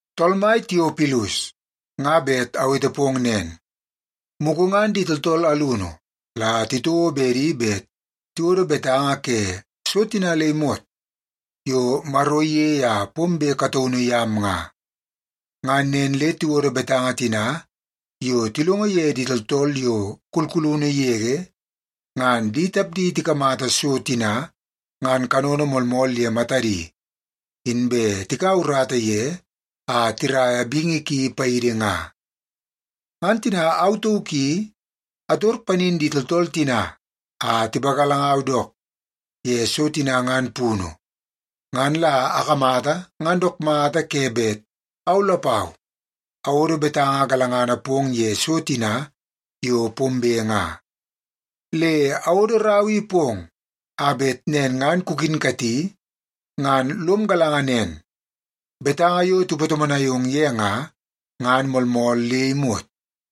Tool mai Tiopilus, nga bet awete pong nen, mugu ngan di tooltool alunu la titouo bedi bet tiwodo betanga ke so tina le imot yo Maro iyei a pombe kataunu yam nga. Ngan nen le tiwodo betanga tina yo tilongo ye di tooltool yo kulkulunu yege, ngan di tapdi tikamata so tina ngan kanono moolmool ye matadi, inbe tikaua urata ye a tiraia bingi ki paidi nga. Ngan tina au tauk i ator panin di tooltool tina a tipagalangau dook ye so tina ngan punu, ngan la akamata ngan dook mata ke bet au lapau awodo betanga galangana pong ye so tina yo pombe nga. Le awodo rau i pong a bet nen ngan kukinkati ngan lom galanga nen, betanga yo tipatomonai ong ye nga, ngan moolmool le imot.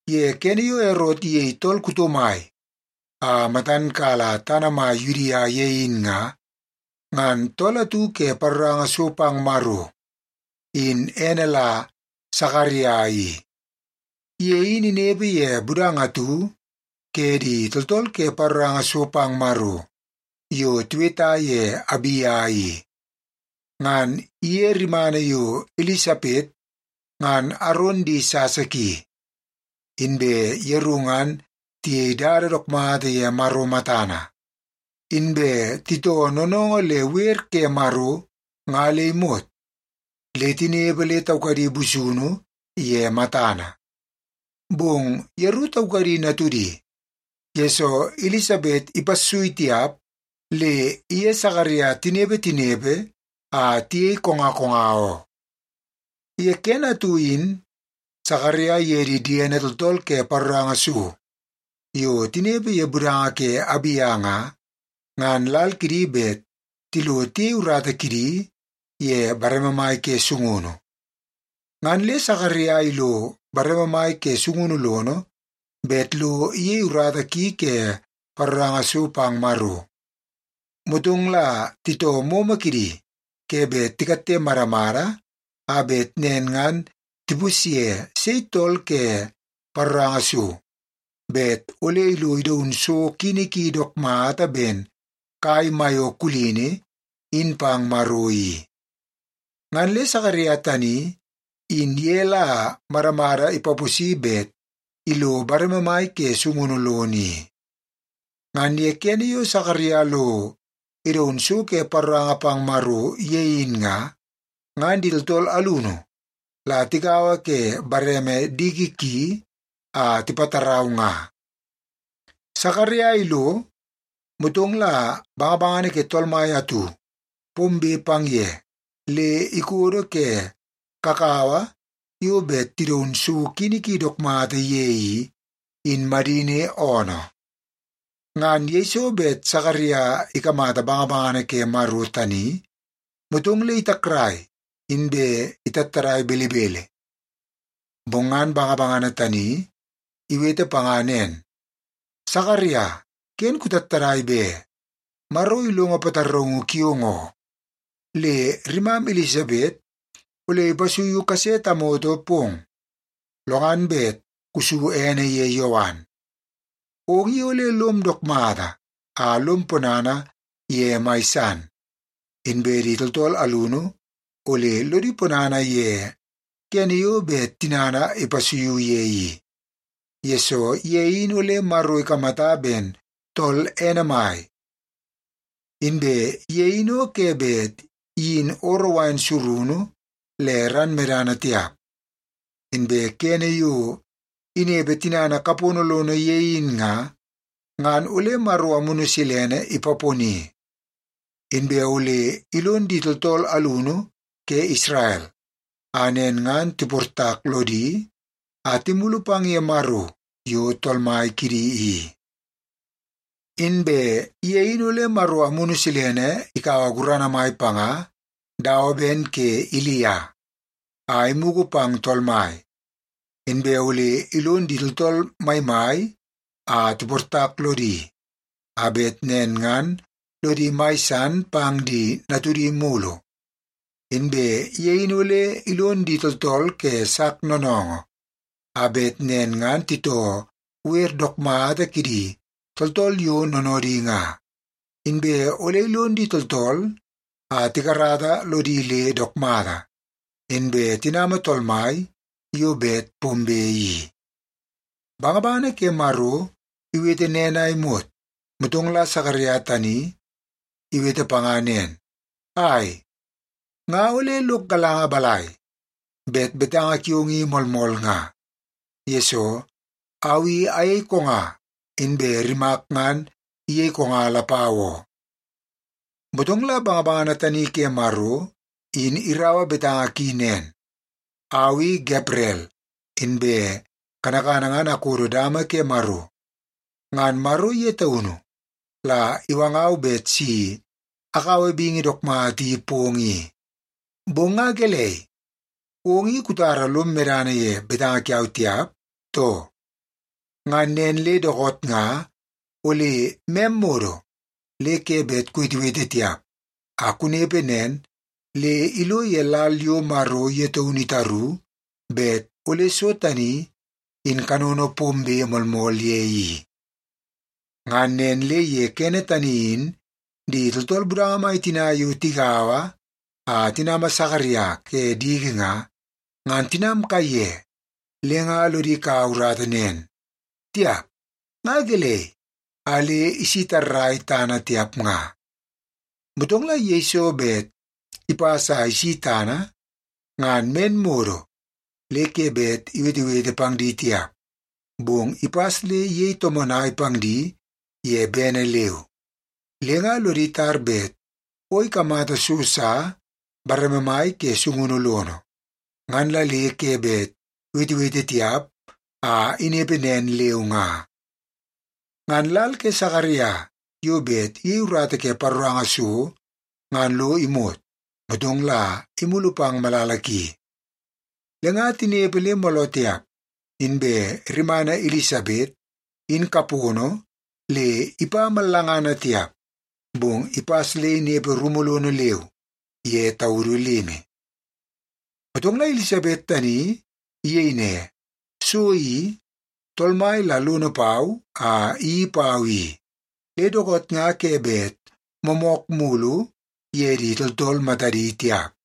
Ye kene yo Erot iyei tool kuto mai a matan kala tana mai Yudia ye in nga, ngan tool atu ke paroranga so pang Maro, in ene la Sakaria i. Ye in inepe ye budanga atu ke di tooltool ke paroranga so pang Maro yo tiweta ye Abia i. Ngan iye rimana yo Ilisapet, ngan Aron di sasa ki. Inbe yeru ngan tiyei dada dook mata ye Maro matana. Inbe titoo noonoongoo le wer ke Maro nga le imot, le tinepe le taukadi busunu ye matana. Bong yeru taukadi natudi, yesoo Ilisapet ipassui tiap le iye Sakaria tinepe tinepe a tiyei konga konga oo. Ye kene atu in Sakaria iye di diene tooltool ke paroranga so yo tinepe ye budanga ke Abia nga, ngan lal kidi bet tilo tiyei urata kidi ye bareme mai ke sungunu. Ngan le Sakaria ilo bareme mai ke sungunu lono bet lo iyei urata ki ke paroranga so pang Maro. Motong la titoo momo kidi ke bet tikatte madamada a bet nen ngan tipusye sei tool ke paroranga so, bet ole ilo idaun so kini ki dook mata ben kai maiyo kulini in pang Maro i. Ngan le Sakaria tani, in ye la madamada ipaposi bet ilo bareme mai ke sungunu lono i. Ngan ye kene yo Sakaria lo idaun so ke paroranga pang Maro ye in nga, ngan di tooltool alunu la tigaua ke bareme diki ki a tipattarau nga. Sakaria ilo, motong la bangabangana ke Tool Mai atu pombe pang ye le ikodo ke kakawa yo bet tidaun so kini ki dook mata ye i, in madini oonoo. Ngan yeiso bet Sakaria ikamata bangabangana ke Maro tani, motong le itakrai inbe itattadai belebele. Bong ngan bangabangana tani iwete panga nen, “Sakaria, ken kutattadai be! Maro ilongo pataraungu kiong oo. Le rimam Ilisapet ole ipasuiu kase tamoto pong. Lo ngan bet kusu ene ye Yowan. Ong i ole lom dook mata a lom ponana ye mai san, inbe di tooltool alunu ole lodi ponana ye kene yo bet tinana ipasuiu ye i, yesoo ye in ole Maro ikamata ben tool ene mai. Inbe ye in o ke bet iyin ooroo wain surunu le ran medana tiap. Inbe kene yo inepe tinana kapono lono ye in nga, ngan ole Maro Amunu Silene ipaponi. Inbe ole ilon di tooltool alunu ke Isrel a nen ngan tiportak lodi a timulu pang ye Maro yo Tool Mai kidi i. Inbe ye in ole Maro Amunu Silene ikaua gurana mai panga dawa ben ke Ilia, a imugu pang Tool Mai. Inbe ole ilon di tooltool maimai a tiportak lodi, a bet nen ngan lodi mai san pang di natudi mulu. Inbe ye in ole ilon di tooltool ke sak noonoongoo, a bet nen ngan titoo wer dook mata kidi tooltool yo noonoodi nga. Inbe ole ilon di tooltool a tikarata lodi le dook mata, inbe tinama Tool Mai yo bet pombe i.” Bangabangana ke Maro iwete nen a imot, motong la Sakaria tani iwete panga nen, “Ai, nga ole lok galanga balai, bet betanga kiong i moolmool nga? Yesoo, au i ayei konga, inbe rimak ngan iyei konga lapau oo.” Motong la bangabangana tani ke Maro in iraua betanga ki nen, “Au i Gabrel! Inbe kanakana ngan akodo dama ke Maro. Ngan Maro ye taunu la iwangau bet si akaua bingi dook mata i pong i. Bong nga gelei, ong i kutara lom medana ye betanga kiau tiap, too? Ngan nen le dookoot nga ole mem modo le ke bet kuwetewete tiap a kunepe nen le ilo ye lal yo Maro ye taunu itaru bet ole so tani in kanono pombe moolmool ye i.” Ngan nen le ye kene tani in di tooltool budanga mai tina yo tigaua a tinama Sakaria ke diki nga, ngan tinam kaiye le nga lodi kau urata nen, “Tiap, nga gelei a le isi tarrai tana tiap nga.” Motong la yeiso bet ipas a isi tana, ngan men modo le ke bet iwetewete pang di tiap, bong ipas le iyei tomonai pang di ye bene leu. Le nga lodi tar bet o ikamata so sa bareme mai ke sungunu lono, ngan la le ke bet iwetewete tiap a inepe nen leu nga. Ngan lal ke Sakaria yo bet iyei urata ke paroranga so ngan lo imot, motong la imulu pang malala ki. Le nga tinepe le mooloo tiap, inbe rimana Ilisapet in kapono le ipa mallangana tiap, bong ipas le inepe rumu lono leu ye taudu limi. Motong la Ilisapet tani iyei ne, “So i, Tool Mai la lono pau a iyeii pau i. Le dookoot nga ke bet moomook mulu ye di tooltool matadi tiap.”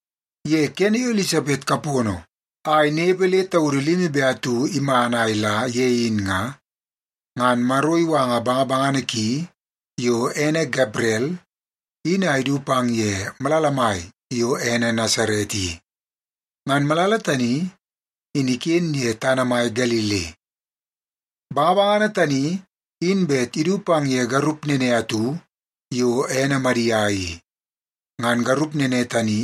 Ye kene yo Ilisapet kapono a inepe le taudu limi be atu iman a ila ye in nga, ngan Maro iwanga bangabangana ki yo ene Gabrel in a idu pang ye malala mai yo ene Nasaret i. Ngan malala tani, in iken ye tana mai Galili. Bangabangana tani in bet idu pang ye garup nene atu yo ene Madia i. Ngan garup nene tani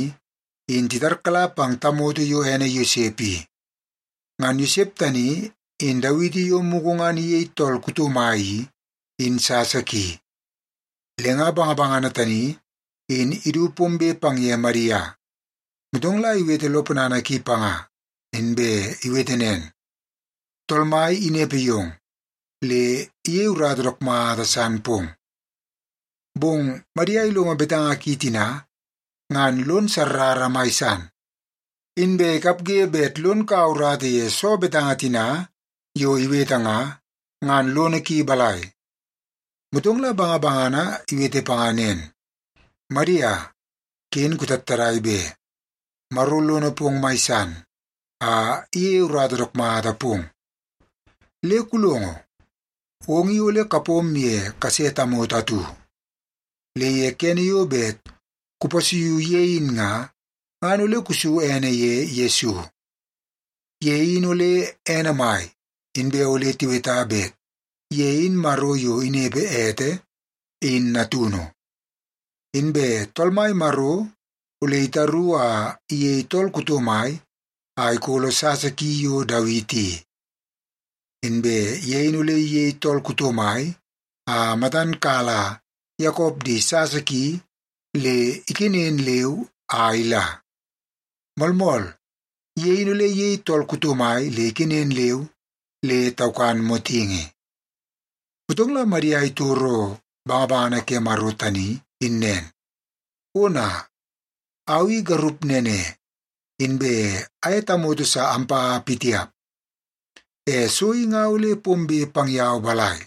in titarkala pang tamoto yo ene Yosep i. Ngan Yosep tani in Dawiti yo mugu ngan iyei tool kuto mai i, in sasa ki. Le nga bangabangana tani in idu pombe pang ye Madia, motong la iwete lo ponana ki panga, inbe iwete nen, “Tool Mai inepe yong, le iyeie urata dook mata san pong.” Bong Madia ilongo betanga ki tina, ngan lon sarrara mai san. Inbe ikapge bet lon kaua urata ye soo betanga tina yo iwete nga, ngan lono ki balai? Motong la bangabangana iwete panga nen, “Madia, ken kutattadai be. Maro lono pong mai san a iyeie urata dook mata pong. Le kulongo, ong i ole kapom ye kase tamoto atu. Le ye kene yo bet kupasuiu ye in nga, ngan ole kusu ene ye Yesu. Ye in ole ene mai, inbe ole tiweta bet ye in Maro yo inepe ete, in natunu. Inbe Tool Mai Maro ole itaru a iyei tool kuto mai a ikolo sasa ki yo Dawiti i. Inbe ye in ole iyei tool kuto mai a matan kala Yakop di sasa ki le ikenen leu a ila. Moolmool, ye in ole iyei tool kuto mai le ikenen leu le taukan motingi.” Motong la Madia itoro bangabangana ke Maro tani in nen, “Ona, au i garup nene, inbe aye tamoto sa ampa pitiap. E so i nga ole pombe pang yau balai?”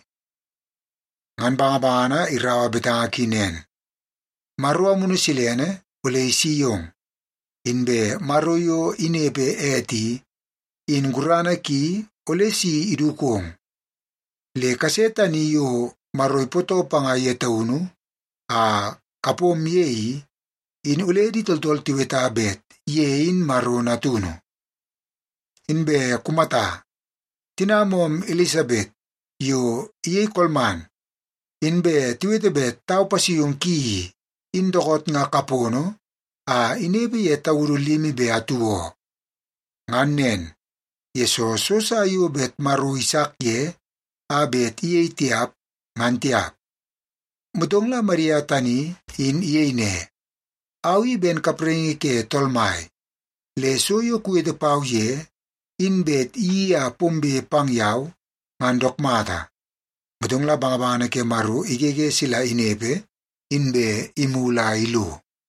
Ngan bangabangana iraua betanga ki nen, “Maro Amunu Silene ole isi yong, inbe Maro yo inepe ete i, in gurana ki ole si idukong. Le kase tani yo Maro ipootoo panga ye taunu a kapom ye i, in ole di tooltool tiweta bet ye in Maro Natunu. Inbe kumata, tinam oom Ilisapet yo iyei kolman, inbe tiwete bet tau pasuiungu ki i, in dookoot nga kapono a inepe ye taudu limi be atu oo. Ngan nen, yesoo so sa yo bet Maro isak ye a bet iyei tiap, ngan tiap.” Motong la Madia tani in iyei ne, “Au i ben kapraingi ke Tool Mai. Le so yo kuwete pau ye, in bet iyeii a pombe pang yau, ngan dook mata.” Motong la bangabangana ke Maro igege sila inepe, inbe imulu a ilo.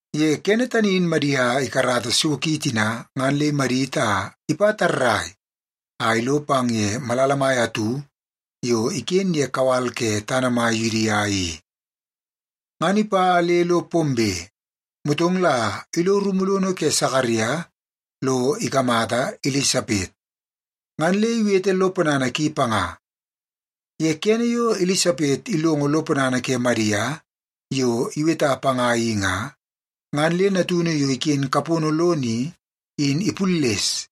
Ye kene tani in Madia ikarata so ki tina ngan le imadit a ipa tarrai a ilo pang ye malala mai atu yo iken ye kawal ke tana mai Yudia i. Ngan ipa le lo pombe, motong la ilo rumu lono ke Sakaria lo ikamata Ilisapet, ngan le iwete lo ponana ki panga. Ye kene yo Ilisapet ilongo lo ponana ke Madia yo iweta panga i nga, ngan le natunu yo iken kapono lono i, in ipulles,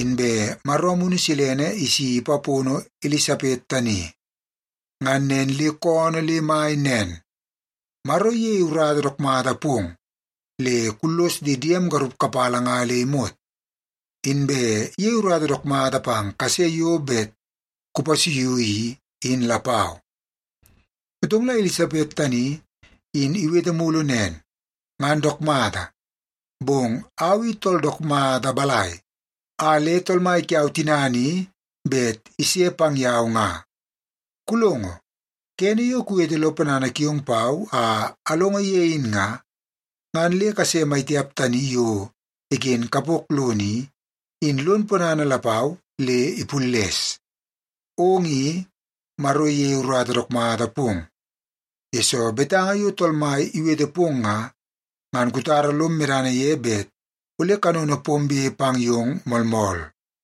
inbe Maro Amunu Silene isi ipapono Ilisapet tani. Ngan nen le koonoo le mai nen, “Maro iyei urata dook mata pong le kullos di diem garup kapala nga le imot. Inbe iyei urata dook mata pang kase yo bet kupasuiu i, in lapau.” Motong la Ilisapet tani in iwete mulu nen, “Ngan dook mata, bong au i tool dook mata balai a le Tool Mai kiau tinana i bet ise pang yau nga? Kulongo, kene yo kuwete lo ponana kiong pau a alongo ye in nga, ngan le kase maitiap tani yo iken kapok lono i, in lon ponana lapau le ipulles. Ong i, Maro iyei urata dook mata pong, yesoo betanga yo Tool Mai iwete pong nga, ngan kutara lom medana ye bet ole kanono pombe pang yong moolmool.”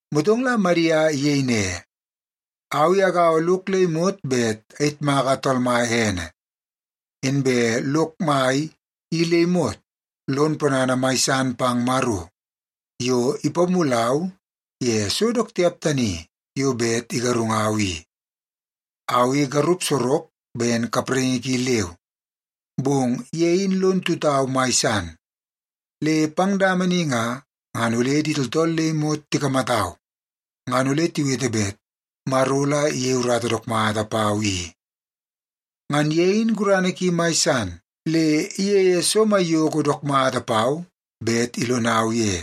Motong la Madia iyei ne, “Au i agaua lok le imot bet ayitmaka Tool Mai ene. Inbe lok mai i le imot lon ponana mai san pang Maro yo ipamulau ye so dook tiap tani yo bet igarungau i. Au i garup sorok ben kapraingi ki leu, bong ye in lon tutau mai san. Le pang dama ni nga, ngan ole di tooltool le imot tikamatau, ngan ole tiwete bet Maro la iyei urata dook mata pau i. Ngan ye in gurana ki mai san, le iyeie so maiyoko dook mata pau bet ilonau ye.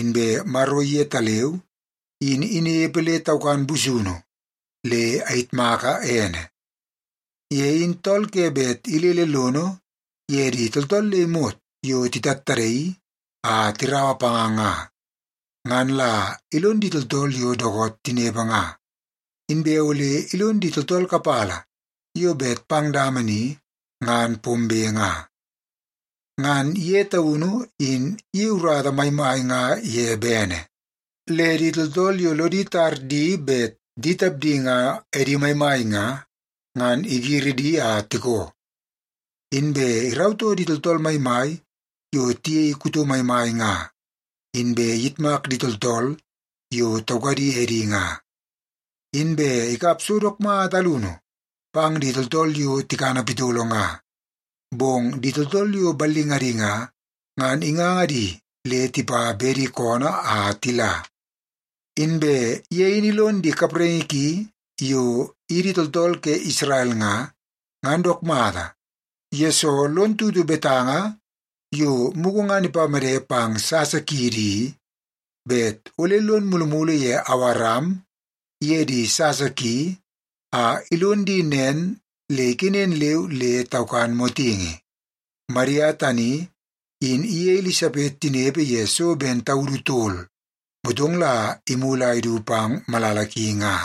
Inbe Maro yetaleu in inepe le taukan busunu, le ayitmaka ene. Ye in tool ke bet ilele lono ye di tooltool le imot yo titattadaii a tiraua panga nga, ngan la ilon di tooltool yo dookoot tinepe nga, inbe ole ilon di tooltool kapala yo bet pang dama ni ngan pombe nga. Ngan ye taunu in iyei urata maimai nga ye bene. Le di tooltool yo lodi tar di bet di tapdi nga edi maimai nga, ngan igiri di a tikoo. Inbe irautoo di tooltool maimai yo tiyei kuto maimai nga, inbe iyitmak di tooltool yo taukadi edi nga. Inbe ikap so dook mata alunu pang di tooltool yo tikana pitolo nga, bong di tooltool yo ballingadi nga, ngan inganga di le tipa bedi koonoo a tila. Inbe ye in ilon di kapraingi ki yo idi tooltool ke Isrel nga, ngan dook mata, yesoo lon tutu betanga yo mugu ngan ipamede pang sasa kiidi i, bet ole lon mulumulu ye Awaram iye di sasa ki a ilon di nen le ikenen leu le taukan motingi.” Madia tani in iye Ilisapet tinepe ye so ben taudu tol, motong la imulu a idu pang malala ki nga.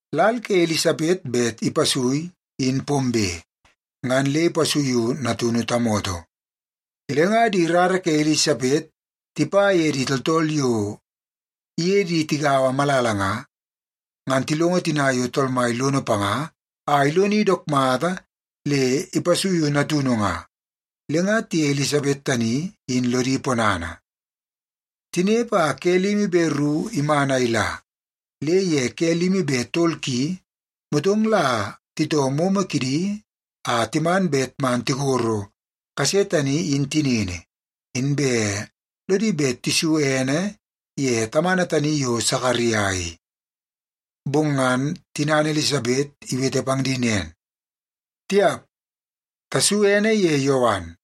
Lal ke Ilisapet bet ipasui in pombe, ngan le ipasuiu natunu tamoto. Le nga di rara ke Ilisapet tipa ye di tooltool yo iye di tigaua malala nga, ngan tilongo tina yo Tool Mai lono panga a iloni dook mata le ipasuiu natunu nga, le nga tiye Ilisapet tani in lodi ponana. Tinepe a ke limi be ru iman a ila, le ye ke limi be tol ki, motong la titoo momo kidi a timan bet man tikoro kase tani in tinini, inbe lodi bet tisu ene ye tamana tani yo Sakaria i. Bong ngan tinana Ilisapet iwete pang di nen, “Tiap! Tasu ene ye Yowan.”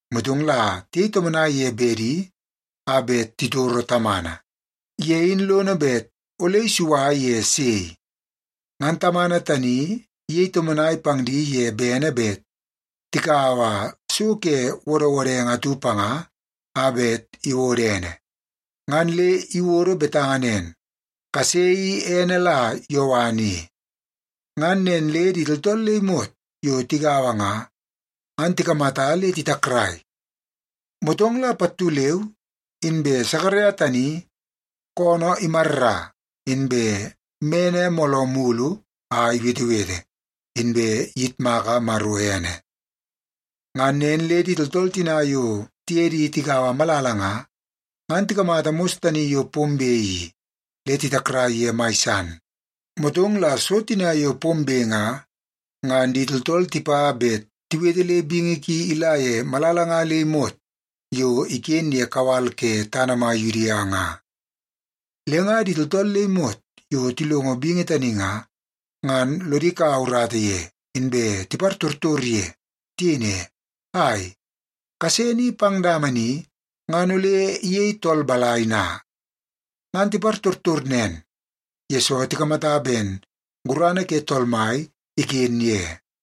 Motong la tiyei tomonai ye bedi a bet titoro tamana, ye in lono bet ole isua ye sei. Ngan tamana tani iyei tomonai pang di ye bene bet tikaua so ke wodwodenge atu panga a bet iwodo ene. Ngan le iwodo betanga nen, “Kase i ene la Yowan i.” Ngan nen le di tooltool le imot yo tigaua nga, ngan tikamata le titakrai. Motong la pattu leu inbe Sakaria tani koonoo imarra, inbe mene mooloo mulu a iwetewete, inbe iyitmaka Maro ene. Ngan nen le di tooltool tina yo tiye di tigaua malala nga, ngan tikamata mos tani yo pombe i, le titakrai ye mai san. Motong la so tina yo pombe nga, ngan di tooltool tipa bet tiwete le bingi ki ila ye malala nga le imot yo iken ye kawal ke tana mai Yudia nga. Le nga di tooltool le imot yo tilongo bingi tani nga, ngan lodi kaua urata ye, inbe tipartortor ye. Tiyei ne, “Ai, kase ni pang dama ni ngan ole iyei tool balai na?” Ngan tipartortor nen, yesoo tikamata ben gurana ke Tool Mai iken ye.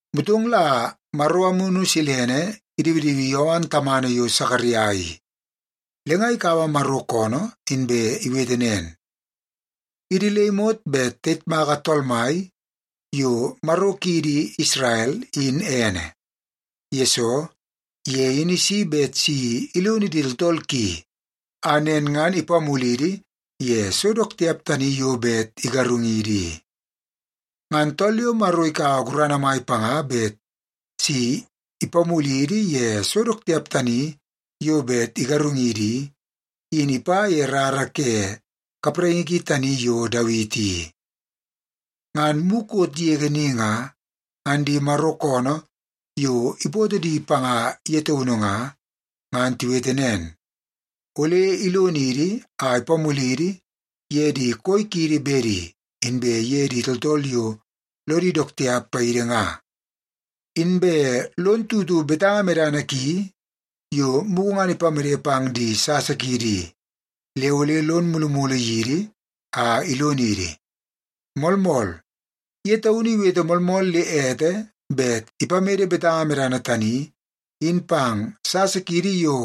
Motong la Maro Amunu Silene idiwidiwi Yowan tamana yo Sakaria i, le nga ikaua Maro koonoo inbe iwete nen, “Idi le imot bet tayitmaka Tool Mai yo Maro kiidi Isrel, in ene! Yesoo, ye in isi bet si ilonidi tooltool ki a nen ngan ipamulidi ye so dook tiap tani yo bet igarungidi i. Ngan tool yo Maro ikaua gurana mai panga bet si ipamulidi ye so dook tiap tani yo bet igarungidi i, in ipa ye rara ke kapraingi ki tani yo Dawiti i. Ngan mukot yege ni nga, ngan di Maro koonoo yo ipootoo di panga ye taunu nga, ngan tiwete nen, ole ilonidi a ipamulidi ye di koi kiidi bedi, inbe ye di tooltool yo lodi dook tiap paidi nga. Inbe lon tutu betanga medana ki yo mugu ngan ipamede pang di sasa kiidi i, le ole lon mulumulu yidi a ilonidi. Moolmool, ye taunu iwete moolmool le ete bet ipamede betanga medana tani in pang sasa kiidi yo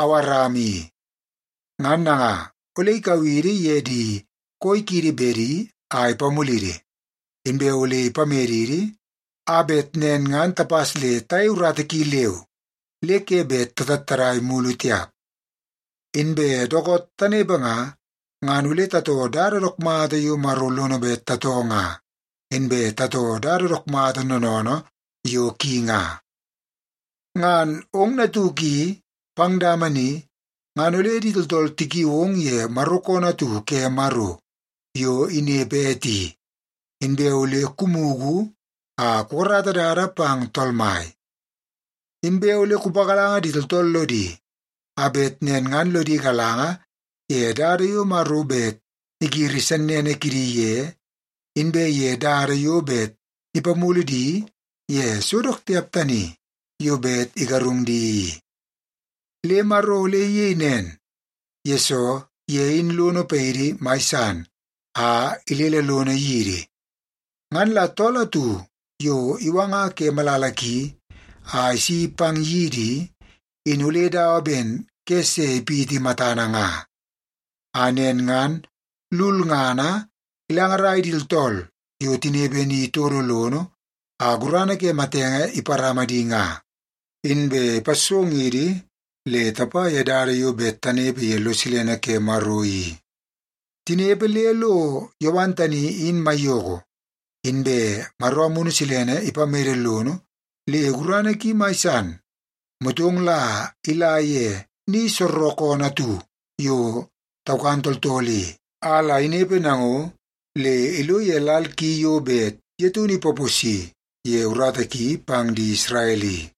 Awaram i. Ngan nanga, ole ikau idi ye di koi kiidi bedi a ipamulidi, inbe ole ipamedidi a bet nen ngan tapas le tayei urata ki leu, le ke bet tatattadai mulu tiap. Inbe dookoot tanepe nga, ngan ole tatoo dada dook mata yo Maro lono bet tatoo nga, inbe tatoo dada dook mata noonoonoo yo ki nga. “Ngan ong natuk i, pang dama ni, ngan ole di tooltool tikiu ong ye Maro koonoo atu ke Maro yo inepe ete i. Inbe ole kumugu a kukarata dada pang Tool Mai. Inbe ole kupagalanga di tooltool lodi a bet nen ngan lodi galanga ye dada yo Maro bet igiri sennene kidi ye, inbe ye dada yo bet ipamulu di ye so dook tiap tani yo bet igarung di i. Le Maro ole iyei nen, yesoo ye in lono paidi mai san a ilele lono yidi. Ngan la tool atu yo iwanga ke malala ki a isi pang yidi i, in ole dawa ben ke se ipiti matana nga. A nen ngan lulngana ilangarai di tooltool yo tinepe ni todo lono a gurana ke matenge iparama di nga, inbe ipassongidi le tapa ye dada yo bet tanepe ye lo silene ke Maro i.” Tinepe le lo Yowan tani in maiyoko, inbe Maro Amunu Silene ipamede lono le gurana ki mai san. Motong la ila ye ni soorookoonoo atu yo taukan tooltool i, a la inepe nango le ilo ye lal ki yo bet ye taunu ipaposi ye urata ki pang di Isrel i.